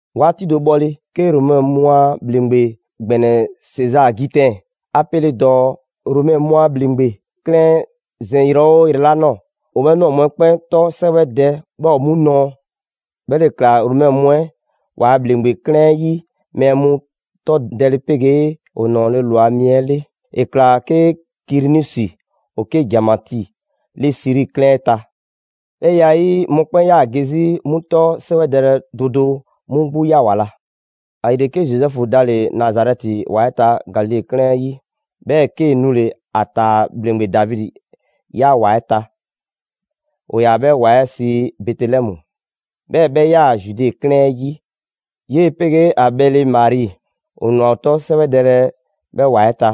'Waati do bhɔle, 'ke Romɛ mu a ‑Bhleŋgbe ‑gbɛnɛ Sezaa Gitɛn 'a 'pele dɔɔ Romɛ mu a ‑bhleŋgbe 'klɛɛn 'ɛ zɛn yrɛ 'oo yrɛ 'la ꞊nɔɔ, ‑o 'bhɛ ꞊nɔɔ mu 'ɛ 'kpɛn 'tɔ 'sɛwɛdɛ 'bhɛɛ‑ ‑o 'mu nɔɔ. 'Bhɛ ‑le ꞊kla Romɛ mu 'ɛ ‑waa' ‑bhleŋgbe 'klɛɛn 'ɛ 'yi mɛɛ mu 'tɔ dɛle 'pegee ‑o ‑nɔɔle' ꞊lwa mi 'ɛ 'le. ‑E ‑kla 'ke Kirinusi ‑o 'ke ‑janmatii 'le Siri 'klɛɛn 'ɛ ta. 'Bhɛ ya 'ɛ 'yi, mɔkpɛn' 'yaa‑ ge 'zi 'mu 'tɔ 'sɛwɛdɛlɛ do do 'mu 'gbu 'ya ‑wa la. ‑Ayile, 'ke Zozɛfu dale‑ Nazarɛti ‑wa 'ɛ ta Galile 'klɛɛn 'ɛ 'yi. 'Bhɛɛ‑ 'kee‑ nule‑ ‑a ‑taa ‑bhleŋgbe Davidi 'ya ‑wa 'ɛ ta. ‑O ‑yaa 'bhɛ ‑wa 'ɛ sii Bɛtelɛmu, 'bhɛɛ‑ 'bhɛ 'yaa‑ Zude 'klɛɛn 'ɛ 'yi. 'Yee‑ 'pegee ‑a bhɛle Mari, ‑o ꞊nwa ‑o 'tɔ 'sɛwɛdɛlɛ 'bhɛɛ‑ ‑wa 'ɛ ta.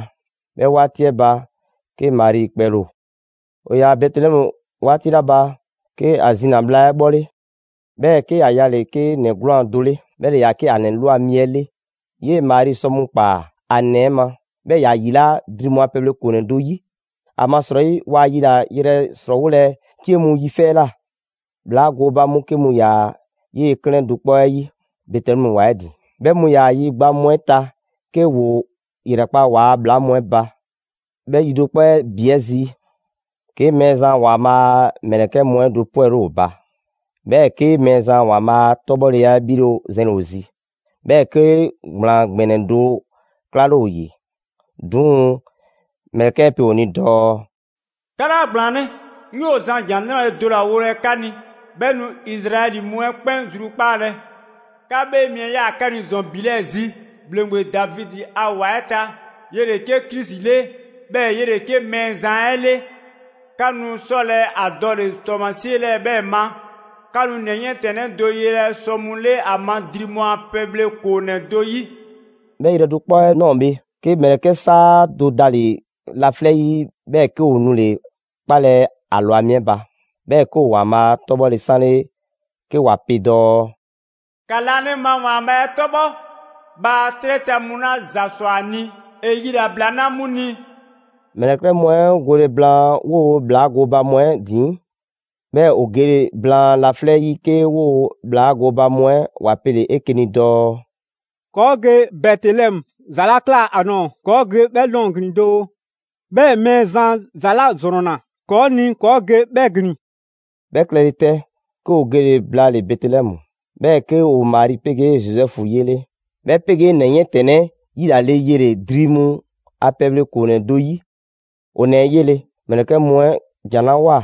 'Bhɛ 'waati 'ɛ ba, 'ke Mari kpɛle ‑o. ‑O ‑yaa Bɛtelɛmu 'waati 'la ba, 'ke ‑a zina‑ bhla 'ɛ 'bhɔle. 'Bhɛɛ‑ 'ke ‑ya yale‑ 'ke ‑nɛ 'gwlaan‑ do 'le, 'bhɛ ‑le ‑yaa 'ke ‑a ‑nɛ ꞊lwa mi 'ɛ 'le. 'Yee‑ Mari sɔ mu ꞊kpaa ‑a ‑nɛ 'ɛ ma, 'bhɛɛ‑ ‑ya ‑yilaa' dri mu a pɛbhle ‑koonɛ do 'yi. ‑Amasrɔyi waa yilayrɛ ‑srɔɔwolɛ 'cie mu yi 'fɛ 'ɛ ꞊la. ‑Bhlaa gooba mu 'ke mu ‑yaa 'yee‑ 'klɛɛn do 'kpɔ 'ɛ 'yi Bɛtelɛmu ‑wa 'ɛ ‑din; 'bhɛ mu ‑yaa yi gba mu 'ɛ ta 'ke ‑woo ‑yrɛkpa' ‑waa' ‑bhlaa mu 'ɛ ba. 'Bhɛ yi do 'kpɔ 'ɛ ‑bi 'ɛ zi, 'ke Mɛɛzan ‑Waanbhaa' a ‑mlɛkɛ' mu 'ɛ do 'pwɛle ‑o ba. 'Bhɛɛ‑ 'ke Mɛɛzan ‑Waanbhaa' a 'tɔbhɔleya 'ɛ 'bhile 'ɛ zɛnle‑ ‑o zi. 'Bhɛɛ‑ 'ke ‑gblaan ‑gbɛnɛ do 'klale ‑o ‑yi. 'Duŋ‑, ‑mlɛkɛ' 'ɛ pe ‑o ni dɔɔ: «'Ka 'laa ‑gblaanlɛ', 'ŋ 'yoo‑ zan ‑jan 'nrale‑ do ‑la wolɛ 'ka ni, 'bhɛ nu Izraɛli mu 'ɛ 'kpɛn zrukpaalɛ. 'Ka 'Bhee Mi 'ɛ ꞊yaa 'ka ni ‑zɔn ‑bi 'lɛɛ‑ zi, ‑bhleŋgbe Davidi a ‑wa 'ɛ ta. 'Yele‑ 'ke Krisi 'le, 'bhɛɛ‑ 'yele‑ 'ke Mɛɛzan 'ɛ 'le. 'Ka nu 'sɔlɛ‑ ‑a dɔle‑ ‑tɔɔmasie 'lɛɛ‑ 'bhɛɛ‑ ma: 'Ka nu ‑nɛ 'yiɛntɛnnɛ do yelɛ sɔ mu 'le 'a ma dri mu a pɛbhle ‑koonɛ' do 'yi.» 'Bhɛ yrɛ do 'kpɔ 'ɛ ꞊nɔɔ bhe, 'ke ‑mlɛkɛ' 'saa do dale‑ laflɛ' 'yi, 'bhɛɛ‑ 'ke ‑o nule‑ 'kpalɛ‑ ‑a ‑lwa mi 'ɛ ba, 'bhɛɛ‑ 'ke ‑o ‑Waanbhaa' 'tɔbhɔle 'sanle 'ke ‑wa pe dɔɔ: «‑Ka laanima ‑Waanbhaa' 'ɛ 'tɔbhɔ, bhaa 'trɛ ta mu 'la ‑za sɔ a ni, ‑e yilabla 'na 'mu ni!» ‑Mlɛkɛ' mu 'ɛ ‑o gole blaan 'woo‑ ‑bhlaa gooba mu 'ɛ ‑din, 'bhɛɛ‑ ‑o gele blaan laflɛ' 'yi, 'ke 'woo‑ ‑bhlaa gooba mu 'ɛ ‑wa pele‑ 'eke‑ 'ni dɔɔ: «‑Kɔɔ' ge Bɛtelɛmu, ‑za 'la ꞊kla ‑a ꞊nɔɔ ‑kɔɔ' ge 'bhɛ ꞊nɔɔ ‑glin doo, 'bhɛɛ‑ Mɛɛzan ‑za 'la 'zrɔnna‑ ‑kɔɔ' ni ‑kɔɔ' ge 'bhɛ ‑glin.» 'Bhɛ klɛle 'tɛ, 'ke ‑o gele‑ blaale‑ Bɛtelɛmu, 'bhɛɛ‑ 'ke ‑o Mari 'pegee Zozɛfu 'yele, 'bhɛ 'pegee ‑nɛ 'yiɛntɛnnɛ 'ɛ 'yilale yele‑ dri mu a pɛbhle ‑koonɛ do 'yi. ‑O ‑nɛ 'ɛ 'yele‑, ‑mlɛkɛ' mu 'ɛ ‑jan 'la ꞊woa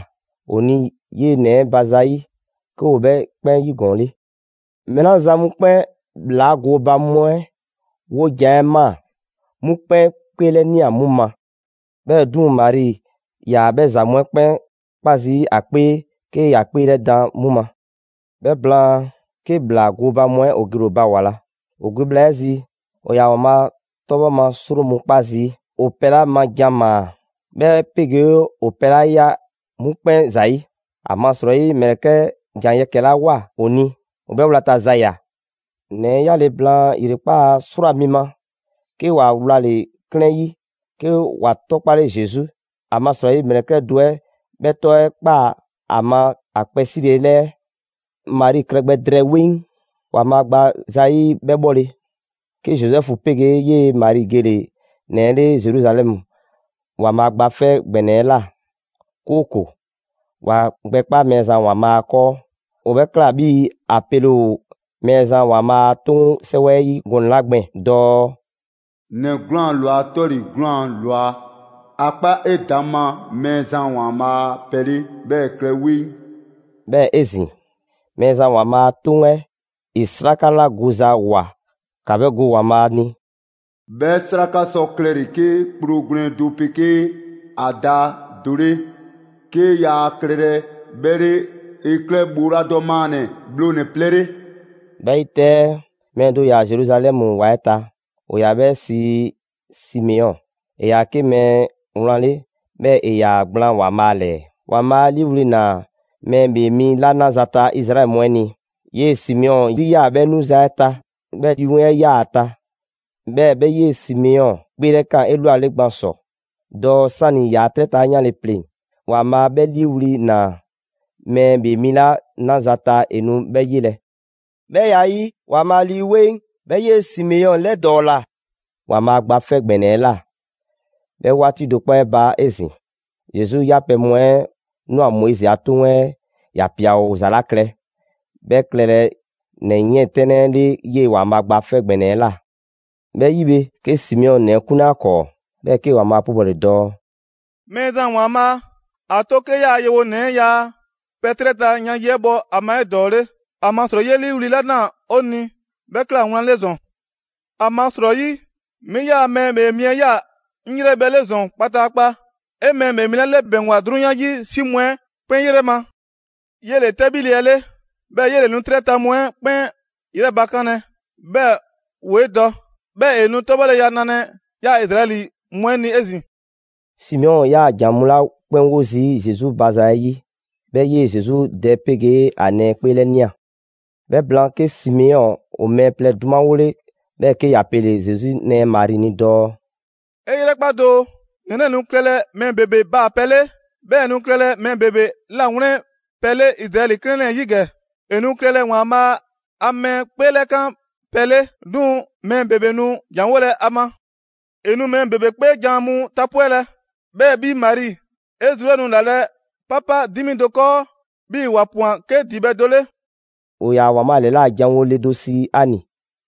‑o ni 'yee‑ ‑nɛ 'ɛ ba zayi', 'ke ‑o 'bhɛ 'kpɛn 'yigɔɔnle. Mɛɛ 'la zan mu 'kpɛn ‑bhlaa gooba mu 'ɛ 'wojan‑ 'ɛ ꞊maa, 'mu 'kpɛn 'kpeelɛnia 'mu ma. 'Bhɛɛ‑ 'duŋ‑ Mari ‑yaa 'bhɛ ‑za mu 'ɛ 'kpɛn 'kpa zii' ‑a 'kpee 'ke ‑ya 'kpeelɛdan 'mu ma. 'Bhɛ blaan, 'ke ‑bhlaa gooba mu 'ɛ ‑o gele‑ ‑o ba ‑wa la. ‑O ge bhla 'ɛ zi, ‑o ‑yaa ‑Waanbhaa' 'tɔbhɔ ma 'sro mu 'kpa zii' ‑o pɛ 'la ma jan ‑maa, 'bhɛ 'pegee ‑o pɛ la ꞊ya 'mu 'kpɛn ‑zayi'. ‑Amasrɔyi ‑mlɛkɛ' 'ɛ ‑jan yɛkɛ‑ 'la ꞊woa ‑o ni, ‑o 'bhɛɛ‑ wlata za ꞊ya. ‑Nɛ 'ɛ 'yaale‑ blaan ‑yrekpaa' 'srwaa‑ mi ma, 'ke ‑wa wlale‑ 'klɛɛn 'yi; 'ke ‑wa 'tɔkpale Zesu. ‑Amasrɔyi ‑mlɛkɛ' do 'ɛ 'bhɛɛ‑ 'tɔ 'ɛ ꞊kpaa ‑a ma ‑a kpɛ 'sile‑ ‑lɛɛ. Mari klɛ gbɛ drɛɛ 'weŋ ‑Waanbhaa' gba zayi' 'bhɛ 'bhɔle, 'ke Zozɛfu 'pegee 'yee‑ Mari gele‑ ‑nɛ 'ɛ 'le Zeruzalɛmu ‑Waanbhaa Gba 'Fɛ ‑Gbɛnɛ 'ɛ꞊la, 'kooko‑ ‑wa gbɛkpa Mɛɛzan ‑Waanbhaa' 'kɔɔ. ‑O 'bhɛ ꞊kla 'bhii‑ ‑a pele ‑o Mɛɛzan ‑Waanbhaa' a 'toŋ 'sɛwɛ 'ɛ 'yi gɔnɛ‑ 'la gbɛɛn‑ dɔɔ: «‑Nɛ 'gwlaan‑ ꞊lwa 'tɔle‑ 'gwlaan‑ ꞊lwa, ‑a 'kpa 'edaŋma Mɛɛzan ‑Waanbhaa' pɛ 'le, 'bhɛɛ‑ ‑e klɛ 'weŋ.» 'Bhɛɛ‑ 'ezin‑, Mɛɛzan ‑Waanbhaa' a 'toŋ 'ɛ ‑e 'sraka 'la goza ꞊woa ‑ka 'bhɛ go ‑Waanbhaa' ni. «'Bhɛ 'sraka sɔ klɛle‑ 'ke kpro gwlɛn do 'pegee ‑a da do 'le, 'ke yaa klɛlɛ 'bhɛ 'le, ‑e klɛ ‑bhooladɔ maannɛ‑ bhlonɛ‑ plɛ 'le.» 'Bhɛ 'yi 'tɛ, mɛɛ do ‑yaa Zeruzalɛmu ‑wa 'ɛ ta, ‑o ‑yaa 'bhɛ sii Simeɔn. ‑E ‑yaa 'ke mɛɛ wlan 'le, 'bhɛɛ‑ ‑e ‑yaa gblaan ‑Waanbhaa' ‑lɛɛ. ‑Waanbhaa' 'a 'liiwli‑ ‑naa mɛɛ ‑Bhee mi 'la 'naza‑ ta Izraɛli mu 'ɛ ni, 'yee‑ Simeɔn yri ‑yaa 'bhɛ 'nuza‑ 'ɛ ta. 'Bhɛɛ‑ Lii 'Weŋ 'yaa‑ ‑a ta. 'Bhɛɛ‑ 'bhɛ 'yee‑ Simeɔn 'kpeelɛkaan 'elwale gban ‑sɔ dɔɔ 'sani‑ ‑yaa' 'trɛ ta yanle pleŋ‑, ‑Waanbhaa' 'bhɛ 'liiwli‑ ‑naa mɛɛ ‑Bhee mi 'la 'naza‑ ta, ‑e nu 'bhɛ 'yelɛ‑. 'Bhɛ ya 'ɛ 'yi, ‑Waanbhaa' Lii 'Weŋ 'bhɛ 'yee‑ Simeɔn 'lɛdɔɔla ‑Waanbhaa' Gba 'Fɛ ‑Gbɛnɛ 'ɛ ꞊la. 'Bhɛ 'waati do 'kpɔ 'ɛ ba 'ezin‑, Zesu 'yapɛ‑ mu 'ɛ ‑nwa Moizi a 'Toŋ 'ɛ ‑ya ‑pia ‑o ‑za 'la klɛ 'bhɛɛ‑ klɛlɛ ‑nɛ 'yiɛntɛnnɛ 'ɛ 'le 'yee‑ ‑Waanbhaa' Gba 'Fɛ ‑Gbɛnɛ 'ɛ ꞊la. 'Bhɛ 'yi bhe, 'ke Simeɔn ‑nɛ 'ɛ 'kunle ‑a ‑kɔɔ 'bhɛɛ‑ 'kee‑ ‑Waanbhaa' 'pubɔle dɔɔ: «Mɛɛzan ‑Waanbhaa', ‑a 'to 'ke 'yaa‑ yewonɛ 'ɛ ‑yaa' pɛ 'trɛ ta yan yi 'ɛ bhɔ ‑a ma 'edɔɔle; ‑amasrɔyi 'yee‑ 'liiwli‑ 'la ꞊naa 'o ni 'bhɛ 'kla‑ wlan 'le ‑zɔn. ‑Amasrɔyi 'mi 'yaa‑ Mɛɛ ‑Bhee Mi 'ɛ ꞊ya 'ŋ 'yrɛbhɛ‑ 'le ‑zɔn kpataakpa. 'E Mɛɛ ‑Bhee Mi 'la 'lɛbɛŋgwa 'drunyan 'yi 'si mu 'ɛ 'kpɛn 'yrɛ ma. 'Yele‑ 'tɛbhile 'ɛ 'le, 'bhɛɛ‑ 'yele‑ nu 'trɛ ta mu 'ɛ 'kpɛn 'yrɛ bakanlɛ, 'bhɛɛ‑ ‑woo' 'e dɔ. 'Bhɛɛ‑ ‑e nu 'tɔbhɔleya nalɛ 'yaa‑ Izraɛli mu 'ɛ ni 'ezin‑.» Simeɔn 'yaa‑ ‑jan mu 'la 'kpɛn 'wo zii' Zesu ba zayi' 'bhɛ 'yee‑ Zesu dɛ 'pegee ‑a nɛɛ 'kpeelɛnia. 'Bhɛ blaan 'ke Simeɔn ‑o mɛɛ plɛ 'dumawole, 'bhɛɛ‑ 'ke ‑ya pele‑ Zesu nɛɛ Mari ni dɔɔ: «'E 'yrɛkpa doo! ‑Nɛ 'lɛɛ‑ nu klɛlɛ mɛɛ ‑bebe baapɛ 'le, 'bhɛɛ‑ ‑e nu klɛlɛ mɛɛ ‑bebe 'lawlɛnpɛ 'le Izraɛli 'klɛɛn 'lɛɛ‑ 'yi ‑gɛ. ‑E nu klɛlɛ ‑Waanbhaa' a mɛɛ 'kpeelɛkan pɛ 'le. 'Duŋ‑ mɛɛ ‑bebe nu ‑janwolɛ ‑a ma. ‑E nu mɛɛ ‑bebe 'kpeejan‑ mu tapwɛlɛ. 'Bhɛɛ‑ 'bhi Mari, 'e zru 'ɛ nu ‑lalɛ' 'papa 'dimi do 'kɔɔ 'bhii‑ ‑wa ꞊pwan 'ke ‑dibhɛ' do 'le.» ‑O ‑yaa ‑Waanbhaa' ‑lɛla' janwo le do sii Ani,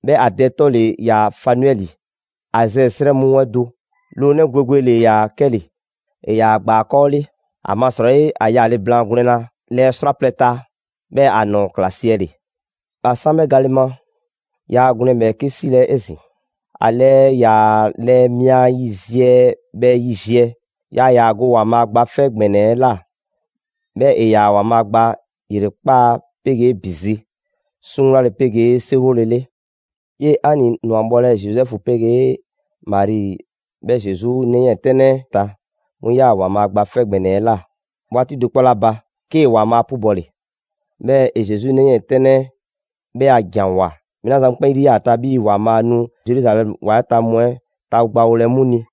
'bhɛɛ‑ ‑a dɛ 'tɔ ‑le ‑yaa Fanuɛli, Azɛɛ 'srɛ mu 'ɛ do. Loonɛ' gwegwe ‑le ‑yaa 'kɛle‑. ‑E ‑yaa ‑a ‑gbaakɔɔ' 'le, ‑amasrɔyi ‑a yaale blaan gwlɛnna lɛɛ 'srwaplɛ‑ ta, 'bhɛɛ‑ ‑a ‑nɔɔ ꞊kla siɛle'. ‑A 'san 'bhɛ gale ma, yaa gwlɛn ‑bhɛɛke' 'silɛ‑ 'ezin‑. ‑A lɛɛ ‑yaa lɛɛ mia yiziɛ bhɛ yiziɛ. Yaa ‑yaa ‑a go ‑Waanbhaa' Gba 'Fɛ ‑Gbɛnɛ 'ɛ ꞊la, 'bhɛɛ‑ ‑e ‑yaa ‑Waanbhaa' gba ‑yrekpaa' 'pegee ‑bi zi; 'suŋwlale 'pegee 'seriwolele. 'Yee‑ Ani ꞊nwa bhɔlɛ Zozɛfu 'pegee Mari 'bhɛɛ Zesu 'nɛ 'yiɛntɛnnɛ ta, 'mu 'yaa‑ ‑Waanbhaa' Gba 'Fɛ ‑Gbɛnɛ 'ɛ ꞊la 'waati do 'kpɔ 'la ba, 'kee‑ ‑Waanbhaa' 'pubɔle. 'Bhɛɛ‑ ‑e Zesu ‑nɛ 'yiɛntɛnnɛ 'ɛ 'bhɛ a ‑janwoa mɛɛ 'la zan mu 'kpɛn 'yri 'yaa‑ ‑a ta 'bhii‑ ‑Waanbhaa' nu Zeruzalɛmu‑wa 'ɛ ta mu 'ɛ tagbawolɛ 'mu ni.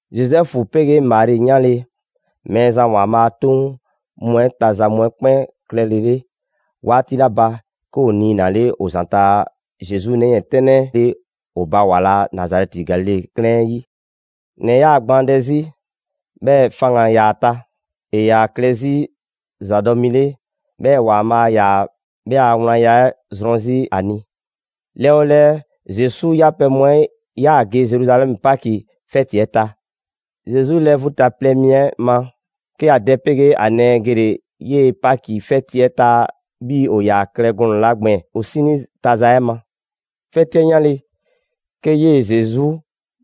Zozɛfu 'pegee Mari 'yanle‑ Mɛɛzan ‑Waanbhaa' a 'toŋ mu 'ɛ ta za mu 'ɛ 'kpɛn klɛlele 'waati 'la ba, 'ke ‑o niinale ‑o ‑zanta' Zesu ‑nɛ 'yiɛntɛnnɛ 'ɛ 'le ‑o ba ‑wa la Nazarɛti Galile 'klɛɛn 'ɛ 'yi. ‑Nɛ 'ɛ 'yaa‑ gbaandɛ 'zi, 'bhɛɛ‑ faŋgan‑ ‑yaa ‑a ta. ‑E ‑yaa klɛ 'zi ‑zadɔ' mi 'le, 'bhɛɛ‑ ‑Waanbhaa' ‑yaa 'bhɛ a wlanya 'ɛ zrɔn 'zi ‑a ni. Lɛɛ 'o lɛɛ, Zesu 'yapɛ‑ mu 'ɛ ‑yaa ge Zeruzalɛmu Paki 'fɛti 'ɛ ta. Zesu lɛɛ vu ta plɛ mi 'ɛ ma, 'ke ‑a dɛ 'pegee ‑a nɛɛ gele‑ 'yee‑ Paki 'fɛti 'ɛ ta 'bhii‑ ‑o ‑yaa klɛ gɔnɛ‑ 'la gbɛɛn‑ ‑o 'sinii ta za 'ɛ ma. 'Fɛti 'ɛ 'yanle‑, 'ke 'yee‑ Zesu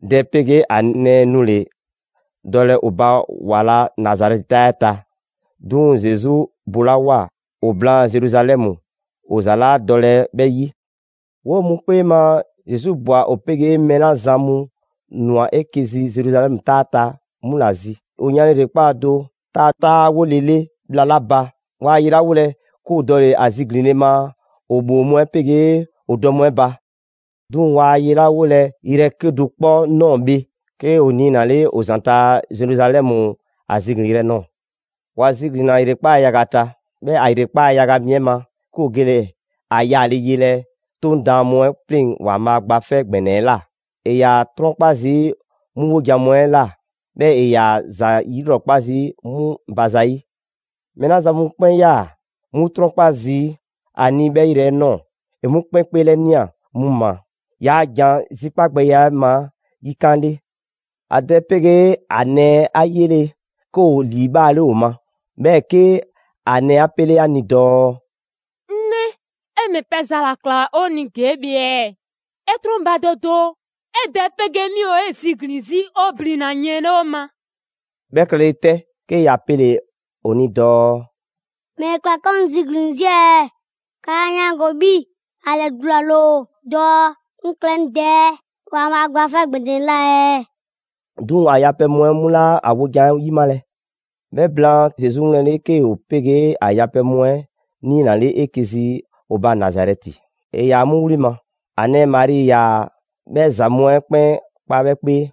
dɛ 'pegee ‑a nɛɛ nule‑ dɔlɛ ‑o ba ‑wa la Nazarɛti 'taa 'ɛ ta. 'Duŋ‑ Zesu bolawoa ‑o blaan' Zeruzalɛmu, ‑o za 'laa dɔlɛ 'bhɛ 'yi. 'Woo‑ mu 'kpee ma, Zesu ꞊bwa ‑o 'pegee mɛɛ 'la zan mu ‑nwa 'eke‑ zi Zeruzalɛmu 'taa 'ɛ ta 'mu ‑la zi. ‑O yanle ‑yrekpaa' do ta 'taawolele bhla 'la ba, waa yelawolɛ, 'ke ‑o dɔle‑ ‑a ziglinle ma ‑o ‑bhoo mu 'pegee ‑o dɔ mu 'ɛ ba. 'Duŋ‑ waa ‑a yelawolɛ yrɛ 'kedo‑ 'kpɔ ꞊nɔɔ bhe, 'ke ‑o niinale ‑o ‑zanta Zeruzalɛmu ‑a ziglinyrɛ nɔɔ‑. ‑Wa ziglinna ‑yrekpaa' yaga ta, 'bhɛɛ‑ ‑a ‑yrekpaa' yaga mi 'ɛ ma, 'ke ‑o gele‑ ‑a yaale yelɛ 'Toŋ daan mu 'ɛ 'pleŋ‑ ‑Waanbhaa' Gba 'Fɛ ‑Gbɛnɛ 'ɛ ꞊la. ‑E ‑yaa ‑a 'trɔnkpa zii' 'mu 'wojan‑ mu 'ɛ ꞊la, 'bhɛɛ ‑e ‑yaa ‑za 'yilrɔkpa zii' 'mu ba zayi'. Mɛɛ 'la zan mu 'kpɛn 'yaa‑ 'mu 'trɔnkpa zii' ‑a ni 'bhɛ yrɛ 'ɛ ꞊nɔɔ, ‑e 'mu 'kpɛn 'kpeelɛnia 'mu ma, yaa ‑jan zikpagbɛya 'ɛ ma yikan' 'le. ‑A dɛ 'pegee ‑a nɛɛ 'a 'yele‑, 'ke ‑o ‑liibhaale ‑o ma. 'Bhɛɛ‑ 'ke ‑a nɛɛ 'a 'pele ‑a ni dɔɔ: «'Ŋ 'nɛ, 'e ‑mɛ pɛ za ‑la ꞊kla ‑o ni ‑gee' bhe ɛɛ? 'E 'trɔnbadɔ doo, 'e dɛ 'pegee 'mi ‑o 'e ziglin‑ 'zi 'o blina‑ yiɛn 'le 'o ma.» 'Bhɛ klɛle 'tɛ, 'ke ‑ya pele‑ ‑o ni dɔɔ: «‑Mɛle ꞊kla 'ka ‑o 'ŋ ziglin‑ 'zi ɛɛ? 'Ka 'laa 'yaango‑ 'bhii‑ ‑a ‑lɛdulale ‑o dɔɔ 'ŋ klɛ 'ŋ Dɛ ‑Waanbhaa' Gba 'Fɛ ‑Gbɛnɛ 'ɛ ꞊la ɛɛ?» 'Duŋ‑ ‑a yapɛ mu 'ɛ 'mu 'laa ‑a wojan 'ɛ 'yimalɛ. 'Bhɛ blaan, Zesu 'wlɛnle‑ 'ke ‑o 'pegee ‑a yapɛ mu 'ɛ niinale 'eke‑ zi ‑o ba Nazarɛti. ‑E ‑yaa 'mu wli ma. ‑A nɛɛ Mari ‑yaa 'bhɛ ‑za mu 'ɛ 'kpɛn kpa 'bhɛ 'kpee.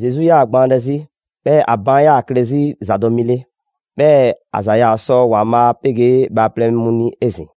Zesu 'yaa‑ gbaandɛ 'zi, bhɛɛ‑ a baan' 'yaa klɛ zi ‑zadɔ' mi 'le. 'Bhɛɛ‑ ‑a ‑za yaa sɔ ‑Waanbhaa' 'pegee bhaaplɛŋ mu ni 'ezin‑.